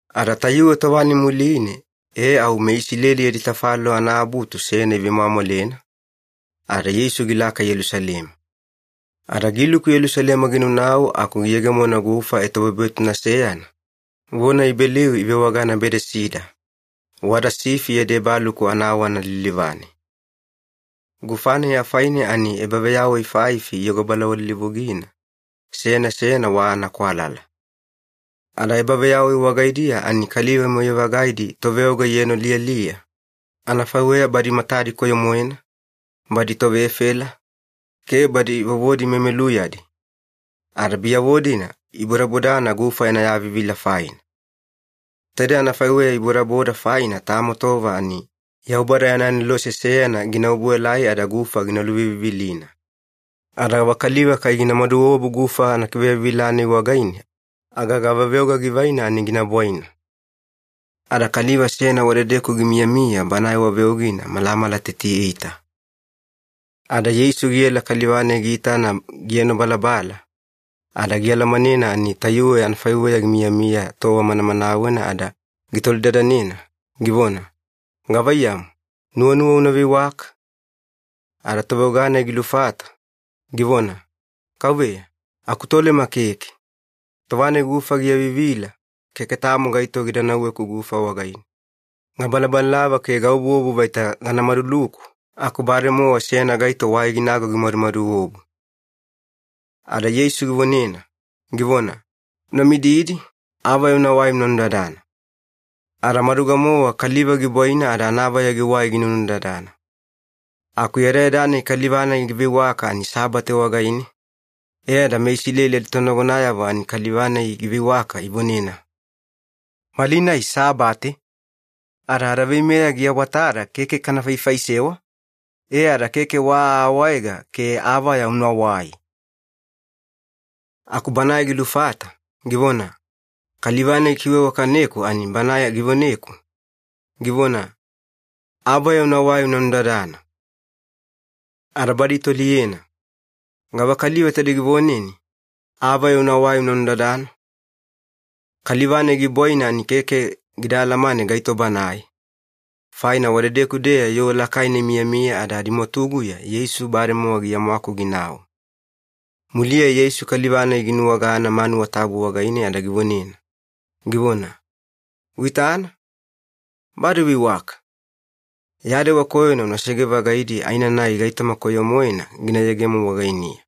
Ada tayuwe tova-nai muline e au meIsileli yadi tafalolo anaabutu seyana ivemwamwalena, ada Yeisu gilaka Yelusalema. Ada giluku Yelusalema ginaunau aku giyegemona gufa etobwebwetuna seyana, vona Ibeliu ivewagana Bedesida, wada sifi yadi ebaluku anawana lilivane. Gufa-nai afaine ani ebaveyawai faifi iyogo balawalilivugina, seyana seyana wa anakwalala. Ada ebaveyawai wagaidiya ani kaliva moyai-vagaidi toveoga ienoliyaliya, anafaiweya badi matadi koyo-moena, badi tovefela, ke badi vovodi memeluyadi, ada biyavo-dina ibodabodana gufa yana yavivila faina. Taide anafaiweya ibodaboda faina tamo tova ani Yaubada yana anelose seyana gina obuelai ada gufa gina luvivivilina. Ada gavakaliva kai gina maduobu gufa anakiveyauvivila-nai wagaine aga gavaveoga givaina ani gina bwaina. Ada kaliva seyana wadedeku gimiyamiya, banae wa veogina malamala teti-eita. Ada Yeisu giela kaliva-nai giitana gienobalabala, ada gialamanena ani tayuwe anafaiweya gimiyamiya tova manamanawena ada gitolidadanena, givona, “Gavaiyamu, nuwanuwa una veiwaka?” Ada toveoga-nai gilufata, givona, “Kauveya, akutolema keke. Tova-nai gufa giavivila, keke tamo gaito gida nauweku gufa wagaine. Gabalabalalava ke gaobuobu vaita gana maduluku, aku bademowa seyana gaito wai ginago gimadumadu obu.” Ada Yeisu givonena, givona, “Una mididi, avaya unawai una nudadana.” Ada maduga-mowa kaliva gibwaina ada anavaya giwai ginunudadana. Aku yadayada-nai kaliva-nai giveiwaka ani Sabate wagaine, e ada meIsileli aditonagonayavo ani kaliva-nai giveiwaka ivonena, “Malinai Sabate, ada adaveimeya giawatada keke kana faifaisewa, e ada keke wa aawaega ke avaya unawai!” Aku banae gilufata, givona, “Kaliva-nai gikiveiwakaneku ani banae givoneku, givona, ‘Avaya unawai una nudadana.’” Ada badi itoliyena, “Gavakaliva taide givoneni, ‘Avaya unawai una nudadana’?” Kaliva-nai gibwaina ani keke gida alamane gaito banae, faina wadedeku-deya yoo lakaina imiyamiya ada adimwatuguya Yeisu bademowa giamwaku ginau. Muliya Yeisu kaliva-nai ginuwagana manuwa tabu wagaine ada givonena, givona, “Uitana, bade uveiwaka! Ya dewa koyona unasege-vagaidi aenanai gaitoma koyo-moena gina yegemo wagainiya.”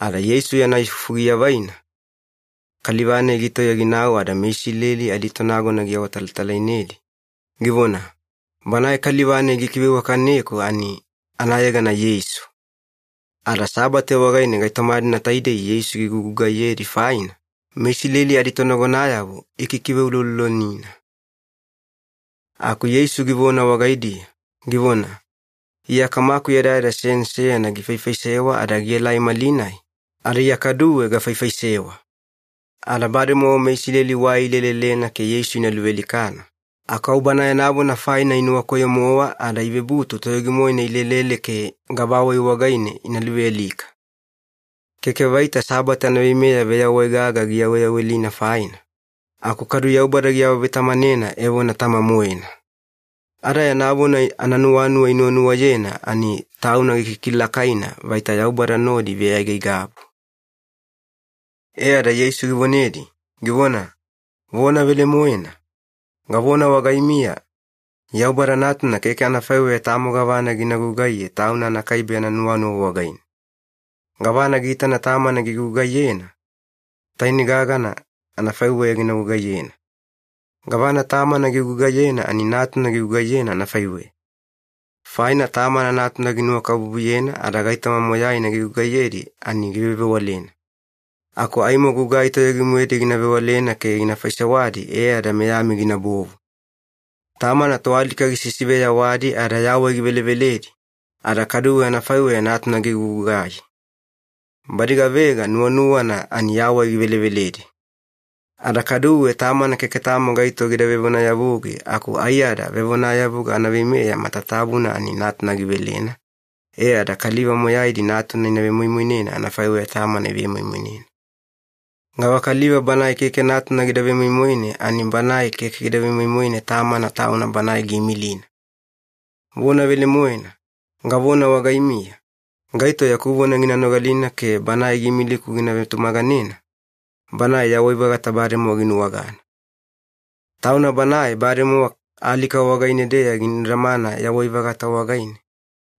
Ada Yeisu yana ifufu giavaina, kaliva-nai gitauya ginau ada meIsileli aditonagona giawatalatalainedi, givona, “Banae kaliva-nai gikiveiwakaneku ani anayegana Yeisu.” Ada Sabate wagaine gaitoma-dina taidei Yeisu gigugugaiyedi faina, meIsileli aditonagonayavo ikikiveuloulolonina. Aku Yeisu givona wagaidiya, givona, “Iya Kamaku yadayada seyana seyana gifaifaisewa ada gielai malinai, ada Iya kaduwe gafaifaisewa.” Ada bademowa meIsileli wai ilelelena ke Yeisu ina luvealikana, aku au Bana yana vona faina inuwakoyo-mowa ada ivebutu toyogi-moena ilelele ke gavawai wagaine ina luvealika. Keke vaita Sabate anaveimeya veyawai gaga giyaweyawelina faina, aku kadu Yaubada giawavetamanena evona Tama-moena. Ada yana vona ananuwanuwa inuwanuwayena ani Tauna gikikilakaina vaita Yaubada nodi iveaigaigabu. E ada Yeisu givonedi, givona, “Vona velemoena, gavona wagaimiya, Yaubada Natuna keke anafaiweya tamo gavana gina gugaiye Tauna anakaibe yana nuwanuwa wagaine. Gavana giitana Tamana gigugaiyena, tainei gagana anafaiweya gina gugugaiyena. Gavana Tamana gigugaiyena ani Natuna gigugaiyena anafaiweya. Faina Tamana Natuna ginuwakabubuyena ada gaitoma moyaina gigugaiyedi ani givevewalena. Aku aimo gugai toyogi-moedi gina vewalena ke gina faisewadi e ada meyami ginabovu. Tamana toalika gisisiveyawadi ada yawai giveleveledi, ada kaduwe anafaiweya Natuna gigugugai. Badi gavega nuwanuwana ani yawai giveleveledi. Ada kaduwe Tamana keke tamo gaito gida vevonayavugi aku aiyada vevonayavuga anaveimeya matatabuna ani Natuna givelena, e ada kaliva moyaidi Natuna ina vemoimoinena anafaiweya Tamana ivemoimoinena. Gavakaliva banae keke Natuna gida vemoimoine ani banae keke gida vemoimoine Tamana Tauna Banae giimilina. Vona velemoena, gavona wagaimiya, gaito yaku vona gina nogalina ke Banae giimiliku gina vetumaganena, banae yawai-vagata bademowa ginuwagana. Tauna banae bademowa alika wagaine-deya ginudamana yawai-vagata wagaine,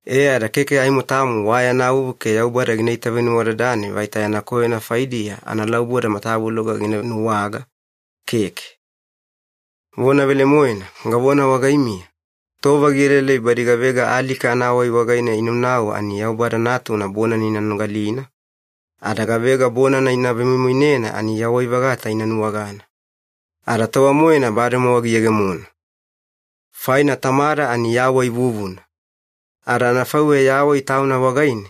e ada keke aimo tamo wa yana vuvu ke Yaubada gina itavenuwadadane vaita yana koyona faidiya analauboda matavuloga gina nuwaga, keke. “Vona velemoena, gavona wagaimiya, tova gielaelai badi gavega alika anawai wagaine inaunau ani Yaubada Natuna bonana ina nogalina, ada gavega bonana ina vemoimoinena ani yawai-vagata ina nuwagana. Ada tova-moena bademowa giyegemona. Faina Tamada ani yawai vuvuna. Ada anafaiweya yawai Tauna wagaine,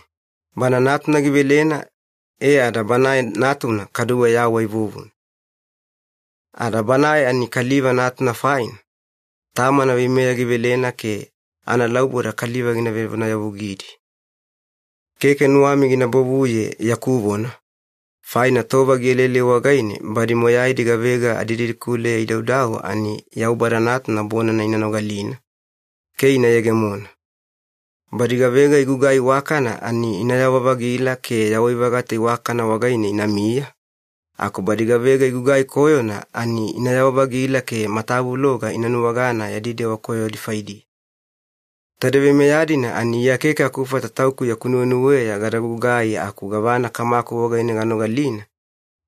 Bana Natuna givelena e ada Banae Natuna kaduwe yawai vuvuna. Ada Banae ani Kaliva Natuna faina, Tamana veimeya givelena ke analauboda kaliva gina vevonayavugidi. Keke nuwami gina bovuye yaku vona, faina tova gielaelai wagaine badi moyaidi gavega adididikuleya idaudau ani Yaubada Natuna bonana ina nogalina ke ina yegemona. Badi gavega igugai iwakana ani inayawa-vagila ke yawai-vagata iwakana wagaine inamiya, aku badi gavega igugai koyona ani inayawa-vagila ke matavuloga ina nuwagana yadi dewa koyodi faidiya. “Taidei veimeya-dina ani Iya keke akufata Tauku yaku nuwenuweya gada gugai aku gavana Kamaku wagaine ganogalina,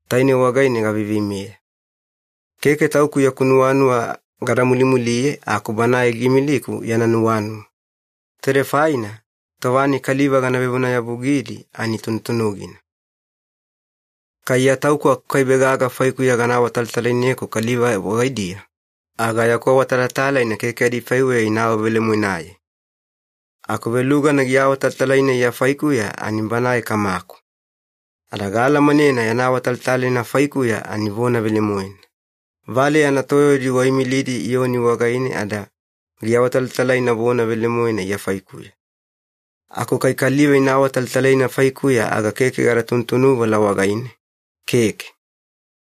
tainei wagaine gaveiveimeya. Keke Tauku yaku nuwanuwa gada mulimuliye aku Banae giimiliku yana nuwanuwa. Taidei faina tova-nai kaliva gana vevonayavugidi ani tunutunugina. Kai Iya Tauku akukaibe gaga faikuya gana awatalatalaineku kaliva wagaidiya, aga yaku awatalatalaina keke adifaiweya ina awavelemoenaye. Aku velugana giawatalatalaina Iya faikuya ani Banae Kamaku. Ada gaalamanena yana awatalatalaina faikuya ani vona velemoena. Valeya anatoyaudi waimilidi Iyoni wagaine ada giawatalatalaina vona velemoena Iya faikuya. Aku kai kaliva ina awatalatalaina faikuya aga keke gada tunutunuvala wagaine, keke.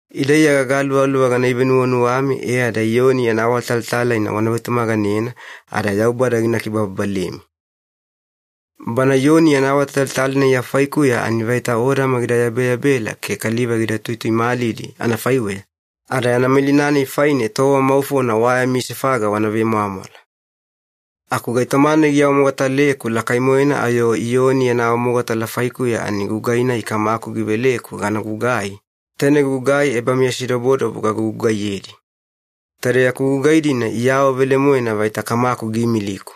Ida Iya gagaluvaluva gana ivenuwanuwami e ada Iyoni yana awatalatalaina wana vetumaganena ada Yaubada gina kibababalemi. Bana Iyoni yana awamogatala Iya faikuya ani vaita odama gida yabeyabela ke kaliva gida tuituimalidi anafaiweya, ada yana malina-nai faine tova maufona wa yami sefaga wavemwamwala. Aku gaitoma-nai giawamogataleku lakai-moena ayo Iyoni yana awamogatala faikuya ani gugai-nai Kamaku giveleku gana gugai, taine gugai ebameyasidobodobo gagugugaiyedi. Taide yaku gugai-dina iawavelemoena vaita Kamaku giimiliku.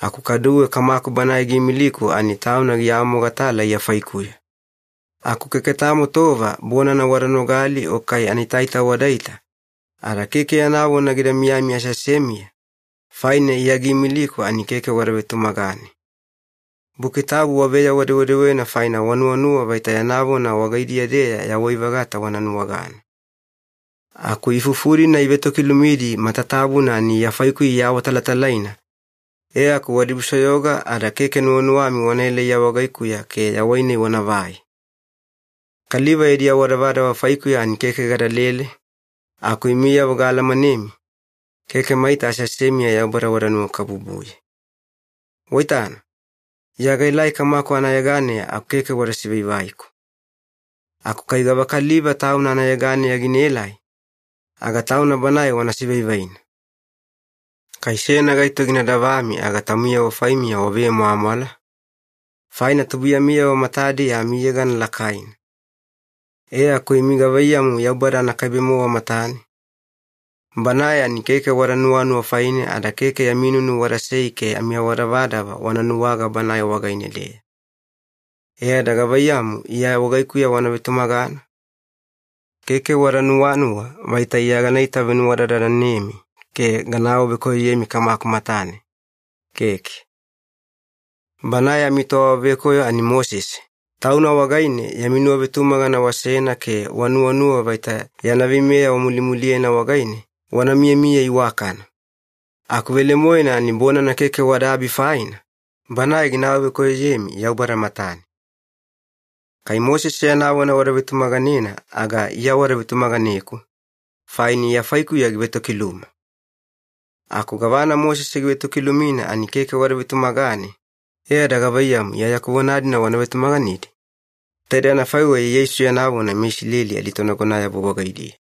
Aku kaduwe Kamaku Banae giimiliku ani Tauna giawamogatala Iya faikuya. Aku keke tamo tova bonana wada nogali o kai anaitaita wadaita ada keke yana vona gida miyami aseasemiya, faina Iya giimiliku ani keke wada vetumagane. Buki Tabu waveyawa-dewedewena faina wanuwanuwa vaita yana vona wagaidiya-deya yawai-vagata wana nuwagana. Aku ifufu-dina ivetokilumidi matatabuna ani Iya faikuya iawatalatalaina, e aku wadibusoyoga ada keke nuwanuwami wanaela Iya wagaikuya ke yawai-nai wana vaina. Kaliva yadi awadavadava faikuya ani keke gadalele, aku imiyavo gaalamanemi, keke maita aseasemiya Yaubada wada nuwakabubuye. Waitana, Iya gaelai Kamaku anayeganeya aku keke wada sivaivaiku. Aku kai gavakaliva tauna anayeganeya ginaelai, aga tauna banae wana sivaivaina. Kai seyana gaito gina davami aga taumiyavo faimiya wavemwamwala, faina tubuiyamiyavo matadiya amiyegana lakaina. E aku imi gavaiyamu Yaubada anakaibe-mowa matane? Banae ani keke wada nuwanuwa faine ada keke yami nunu wadasei ke amiawadavadava wana nuwaga Banae wagaine-deya. E ada gavaiyamu Iya wagaikuya wana vetumagana? Keke wada nuwanuwa vaita Iya gana itavenuwadadanemi ke gana awavekoyoyemi Kamaku matane, keke. Banae amitoawavekoyo ani Mosese, tauna wagaine yami nuwavetumagana wasena ke wanuwanuwa vaita yana veimeya wamulimuliyena wagaine wana miyamiya iwakana. Aku velemoena ani bonana keke wadaabi faina, banae gina awavekoyoyemi Yaubada matane. Kai Mosese yana vona wada vetumaganena aga Iya wada vetumaganeku, faina Iya faikuya givetokiluma. Aku gavana Mosese givetokilumina ani keke wada vetumagane, e ada gavaiyamu Iya yaku vona-dina wana vetumaganedi?” Taidei anafaiweya Yeisu yana vona meIsileli aditonagonayavo wagaidiya.